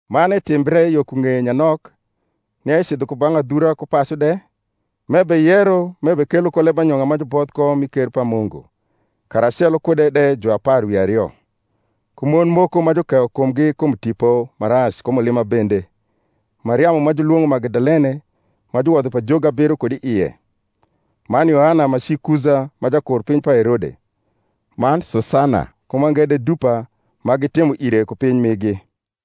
Man etimbre yo ku ng’eye nyanok, nia ecidho ku bang’ adhura ku pacu de, m’ebeyero m’ebekelo ko lembanyong’a ma juboth ko mi ker pa Mungu, karacelo kude de juapar wi ario, ku mon moko ma jukeyo kumgi kum tipo ma rac ku mulima bende: Mariamu ma julwong’o Magdalene, ma juwodho pajogi abiro kud i ie, man Yoana ma ci Kuza ma jakurpiny pa Herode, man Susana, ku mange de dupa, ma gitimo ire ku piny migi.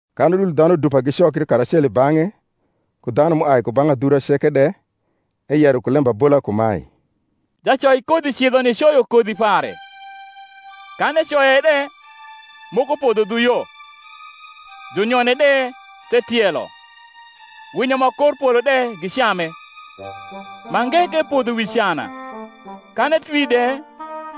Kan udul dhanu dupa gicokri karacelo i bang’e, ku dhanu m’uai ku bang’ adhura ceke de, eyero ku lembabola kumae: Jacoikodhi cidho nicoyo kodhi pare; kan ecoye de, moko podho dhu yo; junyone de the tielo, winyo ma kor polo de gicame. Mange ke podho wi cana; kan etwi de,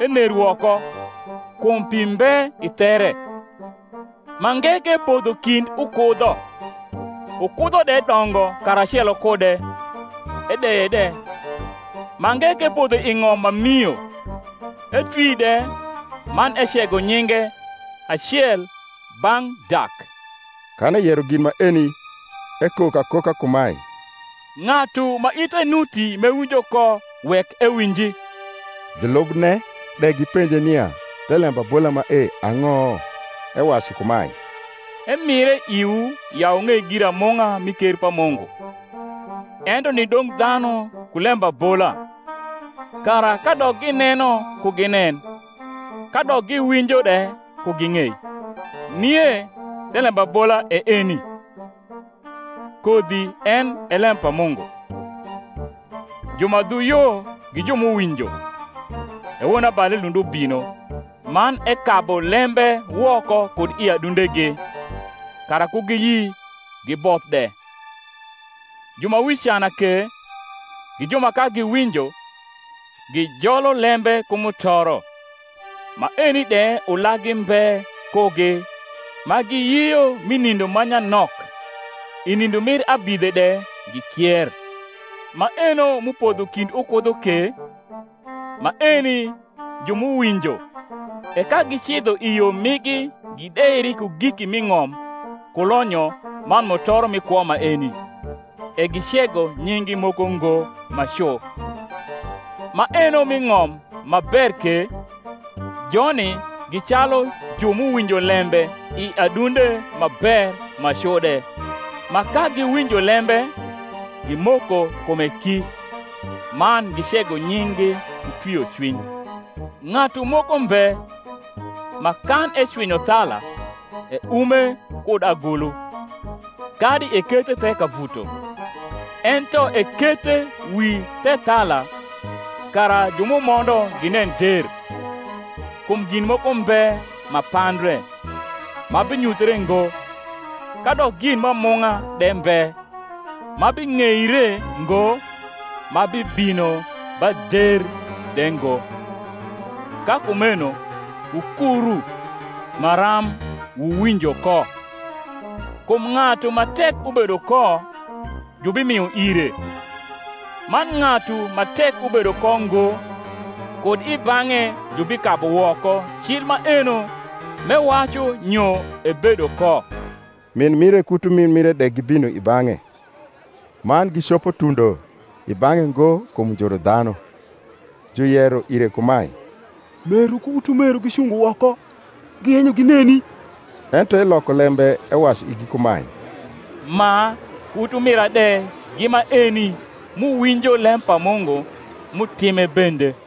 ener woko, kum pi mbe i there. Mange ke podho kind ukudho; ukudho de dongo karacelo kude, edeye de. Mange ke podho i ng’om ma mio, etwi de, man ecego nyinge, acel bang’ dak. Kan eyero gin maeni, ekok akoka kumae, Ng’atu ma ithe nuti m’ewinjo ko, wek ewinji. Julubne de gipenje nia the lembabola mae ang’o. Ewacu kumae, Emire iwii ya wung’ei giramung’a mi ker pa Mungu: ento ni dong’ dhanu ku lembabola; kara kadok gineno ku ginen, kadok giwinjo de ku ging’ei. Nie the lembabola e eni: Kodhi en e lem pa Mungu. Ju ma dhu yo gi ju m’uwinjo; e wonabali lund ubino, man ekabu lembe woko kud i adundegi, kara ku giyi giboth de. Ju ma wi cana ke, gi ju ma ka giwinjo, gijolo lembe ku mutoro; maeni de ulaggi mbe kugi, ma giyio mi nindo ma nyanok, i nindo mir abidhe de gikier. Maeno m’upodho kind ukudho ke, maeni ju m’uwinjo, e ka gicidho i yo migi gideiri ku giki m’i ng’om ku lonyo man mutoro mi kwo maeni, e gicego nying’gi moko ngo ma cu. Maeno m’i ng’om ma ber ke, joni gi calu ju m’uwinjo lembe i adunde ma ber ma cu de, ma ka giwinjo lembe, gimoko kume ki, man gicego nying’gi ku twiocwiny. Ng’atu moko mbe, ma kan ecwinyo thala, eume kud agulu, kadi ekethe the kavuto; ento ekethe wi thethala, kara ju m’umondo ginen der. Kum gin moko mbe ma pandre, ma binyuthre ngo; kadok gin m’amung’a de mbe, ma bing’eire ngo ma bibino ba der de ngo. Ka kumeno wukuru maram wuwinjo ko: kum ng’atu ma tek ubedo ko, jubimio ire; man ng’atu ma tek ubedo ko ngo, kud i bang’e jubikabu woko cil maeno m’ewacu nyo ebedo ko. Min mire ku utumin mire de gibino i bang’e, man gicopo tundo i bang’e ngo kum njuru dhanu. Juyero ire kumae, Meru ku utumeru gicungo woko, giyenyo gineni. Ento eloko lembe ewacu igi kumae, Ma ku utumira de gi maeni m’uwinjo lem pa Mungu, m’utime bende.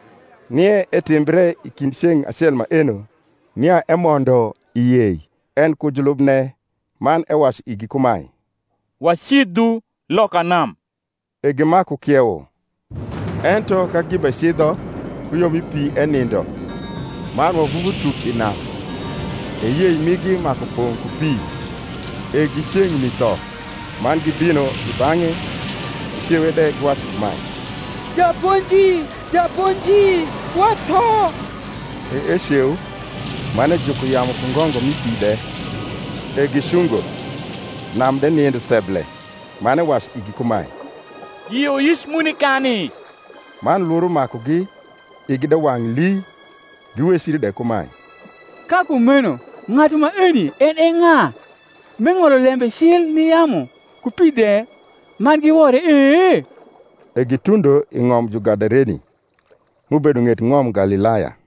Nie etimbre i kind ceng’ acel maeno, nia emondo i yei, en ku julubne; man ewacu igi kumae, Wacidhu loka nam; e gimaku kiewo. Ento ka gibecidho ku yo mi pi enindo: man wavuvu tuk i nam; e yei migi maku pong’ ku pi, e gi ceng’ni tho. Man gibino i bang’e, gicewe de, giwacu kumae, Japonji, japonji, watho. E eceu, man ejuko yamu ku ngongo mi pi de: e gicungo, nam de nindo seble. Man ewacu igi kumae, Yioyic mu nikani? Man lworo makugi igi de wang’ lii, giwecri de kumae, Ka kumeno ng’atu maeni en e ng’a, m’eng’olo lembe cil ni yamu ku pi de, man giwore e? E gitundo i ng’om Jugadareni, m’ubedo ng’et ng’om Galilaya.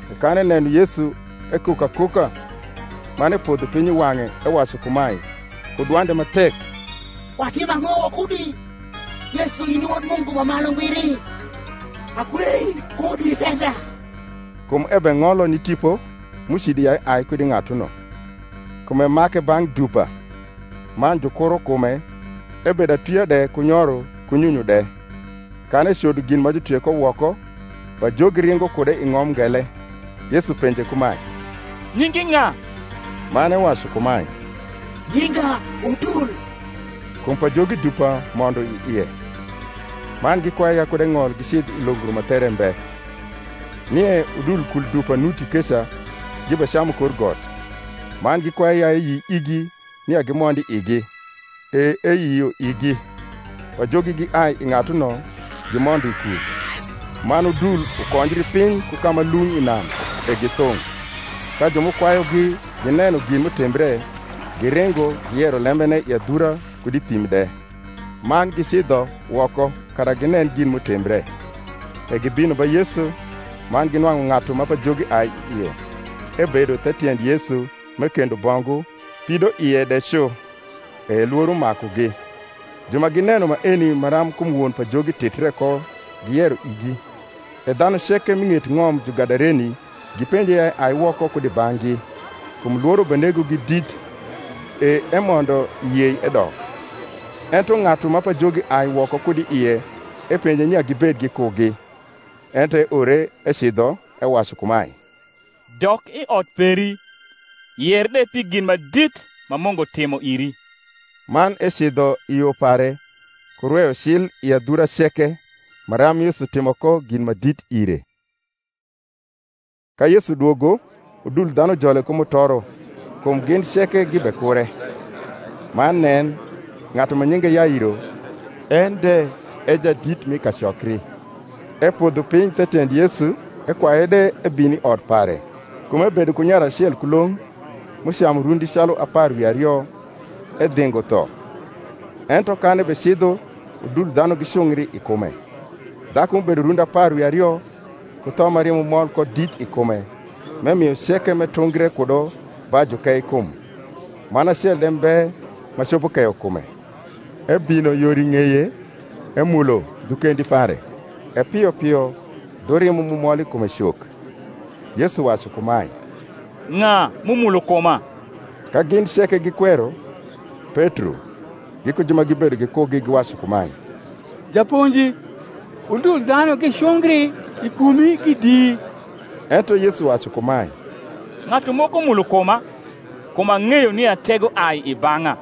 E kan eneno Yesu, ekok akoka, man epodho piny i wang’e, ewacu kumae ku dwande ma tek, Watim ang’o wakudi, Yesu, in i Wod Mungu ma Malu Ngbiri? Akwei, kud isenda. Kum ebeng’olo ni tipo m’ucido ya eai kud i ng’atuno. Kum emake bang’ dupa: man jukuro kume, ebedo atwia de ku nyoro ku nyunyu de; kan ecodo gin ma jutwie ko woko, pajogi ringo kude i ng’om ngele. Yesu penje kumae, Nyingi ng’a? Man ewacu kumae, Nyinga Udul; kum pajogi dupa mondo i ie. Man gikwaye ya kud eng’ol gicidh i longro ma there mbe. Nie udul kul dupa nuti keca gibecamu kor got; man gikwaye ya eyi igi nia gimond i igi. E eyio igi. Pajogi giai i ng’atuno, gimondo i kul: man udul ukonjri piny ku ka ma lung’ i nam, e githung’. Ka ju m’ukwayugi gineno gin m’utimbre, giringo, giyero lembene i adhura kud i thim de. Man gicidho woko kara ginen gin m’utimbre; e gibino ba Yesu, man ginwang’u ng’atu ma pajogi ai i ie, ebedo the tiend Yesu m’ekendo bongu, pidoie de cu: e lworo makugi. Ju ma gineno maeni maram kum won pajogi titre ko giyero igi. E dhanu ceke m’i ng’et ng’om Jugadareni gipenje ya eai woko kud i bang’gi; kum lworo benegogi dit: e emondo i yei, edok. Ento ng’atu ma pajogi ai woko kud i ie epenje nia gibed gikugi: ento eore ecidho, ewacu kumae, Dok i ot peri, yer de pi gin ma dit ma Mungu timo iri. Man ecidho i yo pare, ku rweyo cil i adhura ceke maram Yesu timo ko gin ma dit ire. Ka Yesu dwogo, udul dhanu jole ku mutoro; kum gin ceke gibekure. Man nen, ng’atu ma nyinge Yairo, en de e jadit mi kacokri: epodho piny the tiend Yesu, ekwaye de ebin i ot pare; kum ebedo ku nyare acel kulong’, m’ucamu rundi calu apar wi ario, edhingo tho. Ento kan ebecidho udul dhanu gicungri i kume. Dhaku m’ubedo rundi apar wi ario ku tho ma rimo mol ko dit i kume, m’emio ceke m’etungre kudo ba jukeikum, man acel de mbe ma copo keyo kume. ebino yor i ng’eye, emulo dhu kendi pare: e pio pio dhu rimo m’umol i kume cok. Yesu wacu kumae, Ng’a m’umulo kuma? Ka gin ceke gikwero, Petro, giku ju ma gibedo gikugi giwacu kumae, Japonji, udul dhanu gicungri i kumi gidii. Ento Yesu wacu kumae, Ng’atu moko mulo kuma; kum ang’eyo nia tego ai i bang’a.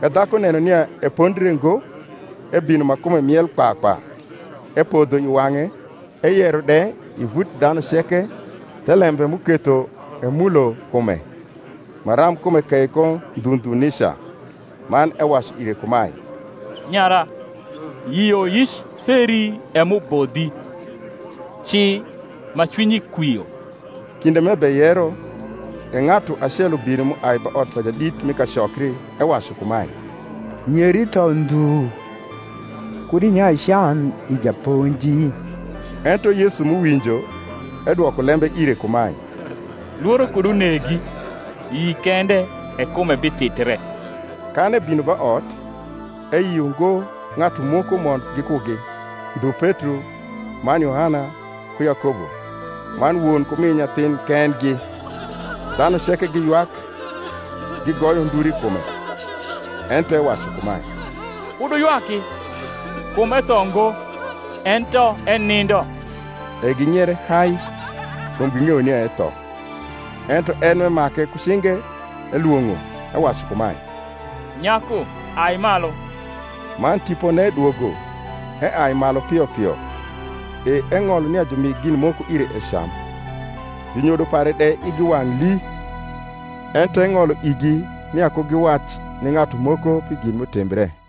Ka dhaku neno nia epondre ngo, ebino ma kume miel kpa kpa, epodho i wang’e, eyero de i vut dhanu ceke thelembe m’uketho emulo kume, maram kume kei ko ndhu ndhu nica. Man ewacu ire kumae, Nyara, yioyic peri e m’ubodhi; ci ma cwinyi kwio. Kinde m’ebeyero, e ng’atu acel ubino m’uai ba ot pa jadit mi kacokri ewacu kumae, Nyeri tho ndhu; kud inyai can i Japonji. Ento Yesu m’uwinjo, edwoko lembe ire kumae, Lworo kud unegi: yi kende, e kume bititre. Kan ebino ba ot, eyio ngo ng’atu moko mond gikugi, ndhu Petro, man Yohana, ku Yakobo, man won ku min nyathin kendgi. Dhanu ceke giywak, gigoyo nduru i kume: ento ewacu kumae, Kud wuywaki: kum etho ngo, ento enindo. E ging’iere hai, kum ging’eyo nia etho. Ento en, m’emake ku cinge, elwong’o, ewacu kumae, Nyaku ai malu. Man tipone dwogo, eai malu pio pio: e eng’olo nia jumi gin moko ire ecam. Junyodo pare de igi wang’ lii: ento eng’olo igi nia ku giwac ni ng’atu moko pi gin m’utimbre.